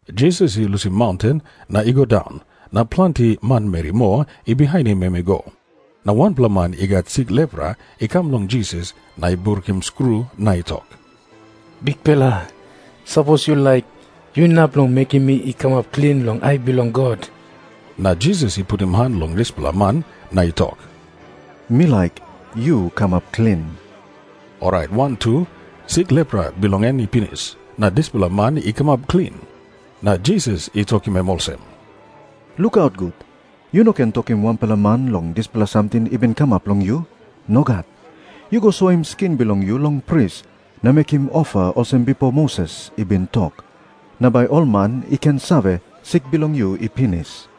Jisas i lusim maunten na i go daun, na planti manmeri moa i bihainim em i go. Na wanpela man i gat sik lepra i kam long Jisas na i brukim skru na i tok, “Bikpela, sapos yu laik, yu inap long mekim mi i kamap klin long ai bilong God.” Na Jisas i putim han long dispela man na i tok, “Mi laik. Yu kamap klin.” Orait wantu sik lepra bilong en i pinis, na dispela man i kamap klin. Na Jisas i tokim em olsem, “Lukaut gut. Yu no ken tokim wanpela man long dispela samting i bin kamap long yu. Nogat. Yu go soim skin bilong yu long pris, na mekim ofa olsem bipo Moses i bin tok. Na bai ol man i ken save, sik bilong yu i pinis.”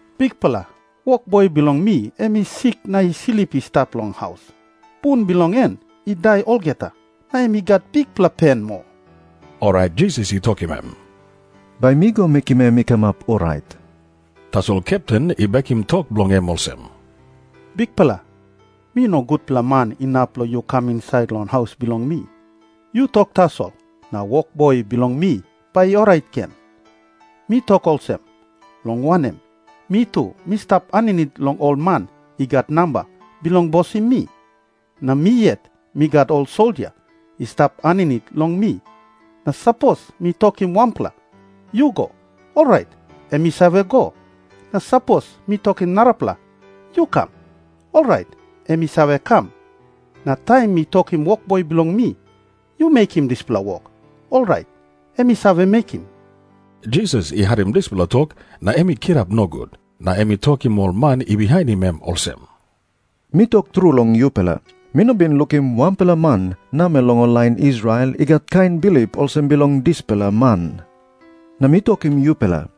“Bikpela, wokboi bilong mi em i sik na i slip i stap long haus. Bun bilong en i dai olgeta, na em i gat bikpela pen moa.” Orait Jisas i tokim em, “Bai mi go mekim em i kamap orait.” Tasol kepten i bekim tok bilong em olsem, “Bikpela, mi no gutpela man inap long yu kam insait long haus bilong mi. Yu tok tasol, na wokboi bilong mi bai i orait gen. Mi tok olsem, long wanem, mi tu mi stap aninit long ol man i gat namba bilong bosim mi. Na mi yet mi gat ol soldia i stap aninit long mi. Na sapos mi tokim wanpela, ‘Yu go,’ orait em i save go. Na sapos mi tokim narapela, ‘Yu kam,’ orait em i save kam. Na taim mi tokim wokboi bilong mi, ‘Yu mekim dispela wok,’ orait em i save mekim.” Jisas i harim dispela tok na em i kirap nogut. Na em i tokim ol man i bihainim em olsem, “Mi tok tru long yupela, mi no bin lukim wanpela man namel long ol lain Israel i gat kain bilip olsem bilong dispela man. “Na mi tokim yupela,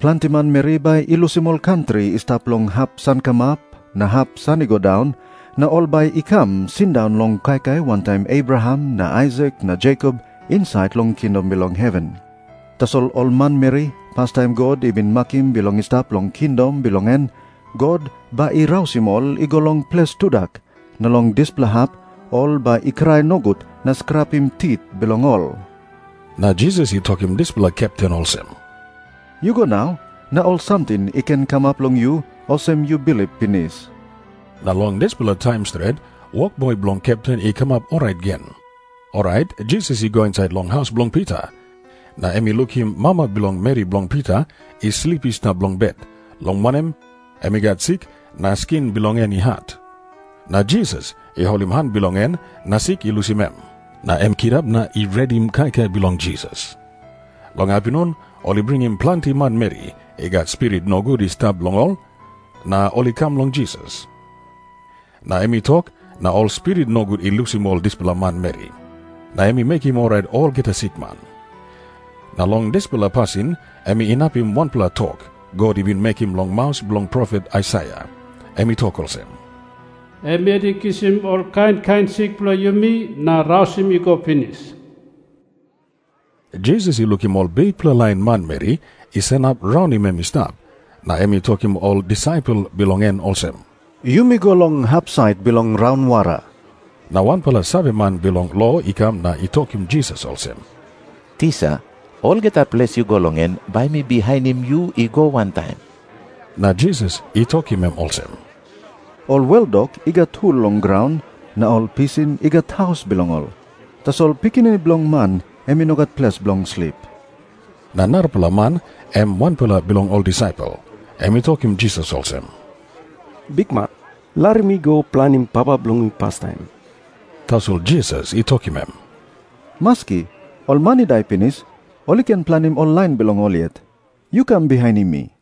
planti manmeri bai i lusim ol kantri i stap long hap sankamap na hap san i go daun, na ol bai i kam sindaun long kaikai wantaim Abraham na Aisak na Jekop insait long kingdom bilong heven. Tasol ol manmeri pastaim God i bin makim bilong i stap long kingdom bilong en, God bai i rausim ol i go long ples tudak. Na long dispela hap ol bai i krai nogut na skrapim tit bilong ol.” Na Jisas i tokim dispela kepten olsem, “Yu go nau. Na ol samting i ken kamap long yu olsem yu bilip pinis.” Na long dispela taim stret, wokboi bilong kepten i kamap orait gen. Orait Jisas i go insait long haus bilong Pita, na em i lukim mama bilong meri bilong Pita i slip i stap long bet, long wanem, em i gat sik na skin bilong en i hat. Na Jisas i holim han bilong en, na sik i lusim em. Na em i kirap na i redim kaikai bilong Jisas. Long apinun ol i bringim planti manmeri i gat spirit nogut i stap long ol, na ol i kam long Jisas. Na em i tok na ol spirit nogut i lusim ol dispela manmeri. Na em i mekim orait olgeta sikman. Na long dispela pasin em inapim wanpela tok God i bin mekim long maus bilong profet Aisaia. Em i tok olsem, “Em yet i kisim ol kain kain sik bilong yumi na rausim i go pinis.” Jisas i lukim ol bikpela lain manmeri i sanap raunim em i stap, na em i tokim ol disaipel bilong en olsem, “Yumi go long hapsait bilong raunwara.” Na wanpela saveman bilong lo i kam na i tokim Jisas olsem, “Tisa, olgeta ples yu go long en, bai mi bihainim yu i go wantaim.” Na Jisas i tokim em olsem, “Ol weldok i gat hul long graun, na ol pisin i gat haus bilong ol. Tasol Pikinini Bilong Man em i no gat ples bilong slip.” Na narapela man, em wanpela bilong ol disaipel, em i tokim Jisas olsem, “Bikman, larim mi i go planim papa bilong mi pastaim.” Tasol Jisas i tokim em, “Maski. Ol man i dai pinis, ol i ken planim ol lain bilong ol yet. Yu kam bihainim mi.”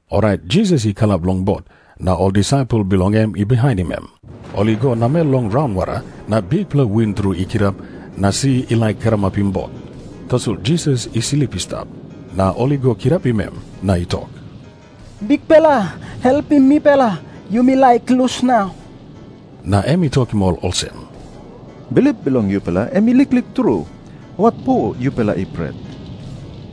Orait Jisas i kalap long bot, na ol disaipel bilong en i bihainim em. Ol i go namel long raunwara na bikpela win tru i kirap na si i laik karamapim bot. Tasol Jisas i slip i stap. Na ol i go kirapim em, na i tok, “Bikpela, helpim mipela. Yumi laik lus nau.” Na em i tokim ol olsem, “Bilip bilong yupela em i liklik tru. Watpo yupela i pret?”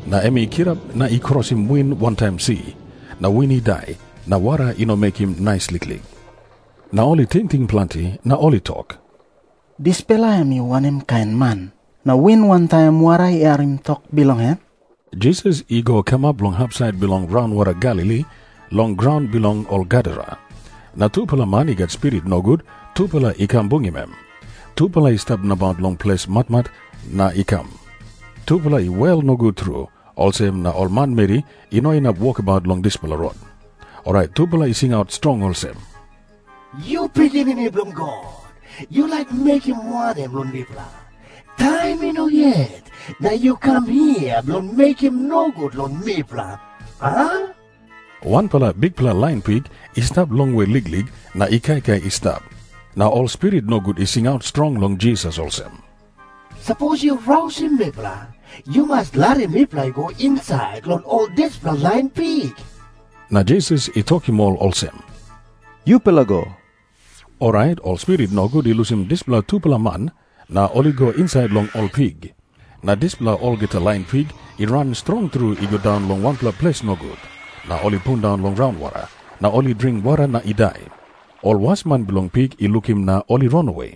Na em i kirap na i krosim win wantaim si. Na win i dai, na wara i no mekim nais liklik. Na ol i tingting planti, na ol i tok, “Dispela em i wanem kain man, na win wantaim wara i harim tok bilong em?” Jisas i go kamap long hapsait bilong raunwara Galili, long graun bilong ol Gadara. Na tupela man i gat spirit nogut, tupela i kam bungim em. Tupela i stap nabaut long ples matmat na i kam. Tupela i wel nogut tru, olsem na ol manmeri i no inap wokabaut long dispela rot. Orait tupela i singaut strong olsem, “Yu Pikinini Bilong God, yu laik mekim wanem long mipela? Taim i no yet, na yu kam hia bilong mekim nogut long mipela, a?” Wanpela bikpela lain pik i stap longwe liklik na i kaikai i stap. Na ol spirit nogut i singaut strong long Jisas olsem, “Sapos yu rausim mipela, yu mas larim mipela i go insait long ol dispela lain pik.” Na Jisas i tokim ol olsem, “Yupela go.” Orait ol spirit nogut i lusim dispela tupela man, na ol i go insait long ol pik. Na dispela olgeta lain pik i ran strong tru i go daun long wanpela ples nogut. Na ol i pundaun long raunwara, na ol i dring wara na i dai. Ol wasman bilong pik i lukim na ol i ranawe.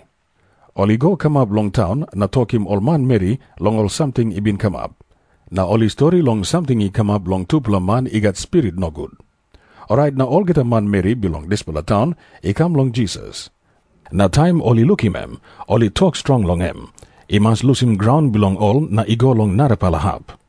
Ol i go kamap long taun na tokim ol manmeri long ol samting i bin kamap. Na ol i stori long samting i kamap long tupela man i gat spirit nogut. Orait na olgeta manmeri bilong dispela taun i kam long Jisas. Na taim ol i lukim em, ol i tok strong long em i mas lusim graun bilong ol na i go long narapela hap.